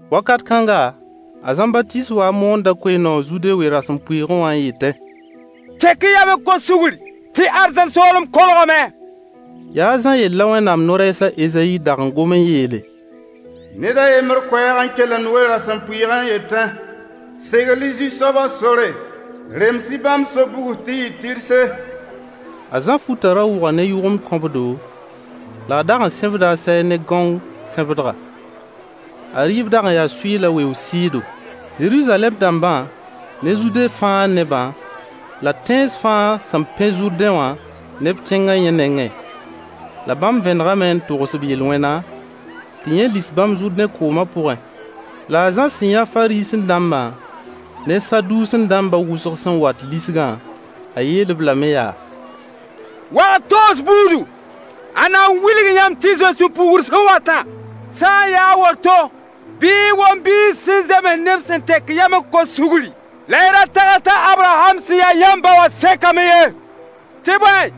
Wakat kãnga, a Zãmbatiis waa n moonda koe-noog Zude we-rasempʋɩɩgẽ wã n yetẽ: Tek-y yam n kos sugr tɩ arzãn soolem kolgame. Yaa a Zã yell la Wẽnnaam no-rɛɛs a Ezayi dag n gom n yeele: Ned a yembr koɛɛg n kelemd we-rasempʋɩɩgẽ n yetẽ: Segl-y Zu-soabã sore. Rems-y bãmb so-bugs tɩ yɩ tɩrse. A Zã futã ra wʋga ne yʋgemd kõbdo, la a dag n sẽbda a sɛɛg ne gãong sẽbdga. A rɩɩb dag n yaa sʋɩy la weoog sɩɩdo. Zeruzalɛm dãmba ne Zude fãa nebã la tẽns fãa sẽn pẽ Zʋrdẽ wã neb kẽnga yẽ nengẽ. La bãmb vẽnegame n togs b yel-wẽna, tɩ yẽ lis bãmb Zʋrdẽ koomã pʋgẽ. La a Zã sẽn yã Fariisẽ-dãmbã ne Saduusẽ-dãmbã wʋsg sẽn wat lisgã, a yeel-b lame yaa: Wag-toos buudu, ãnna n wilg yãmb tɩ y zoe sũ-puugr sẽn watã? Sã n yaa a woto, bɩ y wom biis sẽn zems neb sẽn tek yam n kos sugri, la y ra tags t'a Abraham sẽn ya yãmb ba wã sekame ye. Tɩ bõe,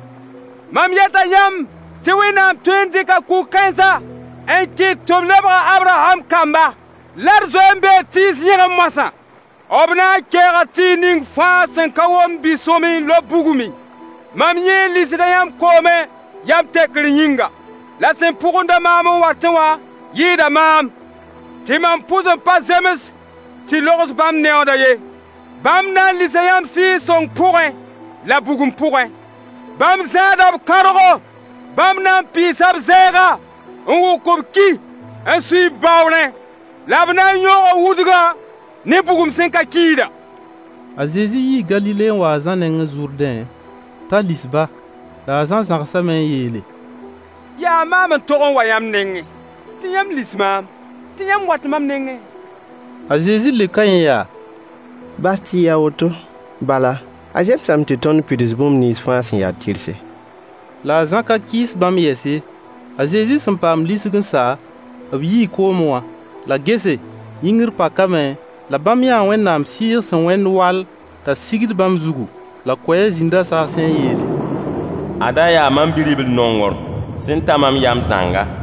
mam yeta yãmb tɩ Wẽnnaam tõe n dɩka kug-kãensã n kɩt tɩ b lebg a Abraham kamba. Lar zoe n bee tɩɩs yẽgẽ moasã. B na n kɛɛga tɩɩg ning fãa sẽn ka womd bi-sõamy n lob bugmẽ. Mam yẽ lisda yãmb koomẽ yam tekr yĩnga, la sẽn pʋgend-a maam n watẽ wã yɩɩda maam, tɩ mam pʋs n pa zems tɩ logs bãmb neooda ye. Bãmb na n lisa yãmb Sɩɩg-sõng pʋgẽ la bugum pʋgẽ. Bãmb zãada b kãorgo. Bãmb na n pɩɩsa b zɛɛga, n wʋk b ki n sui b baoorẽ, la b na n yõoga wudgã ne bugum sẽn ka kiida. A Zezi yii Galile n wa a Zã nengẽ Zʋrdẽ t'a lis-ba. La a Zã zãgsame n yeele: Yaa maam n tog n wa yãmb nengẽ tɩ yãmb lis maam, tɩ yãmb wat mam nengẽ? A Zezi leoka yẽ yaa: Bas tɩ yɩ a woto, bala a zemsame tɩ tõnd pids bũmb nins fãa sẽn ya tɩrse. La a Zã ka kɩɩs bãmb yɛs ye. A Zezi sẽn paam lisg n sa, b yii koomẽ wã. La gese, yĩngr pakame, la bãmb yãa Wẽnnaam Sɩɩg sẽn wẽnd wall t'a sigd bãmb zugu. La koɛɛg zĩnda saasẽ n yeele: Ada yaa mam Bi-ribl-nongr sẽn ta mam yam zãnga.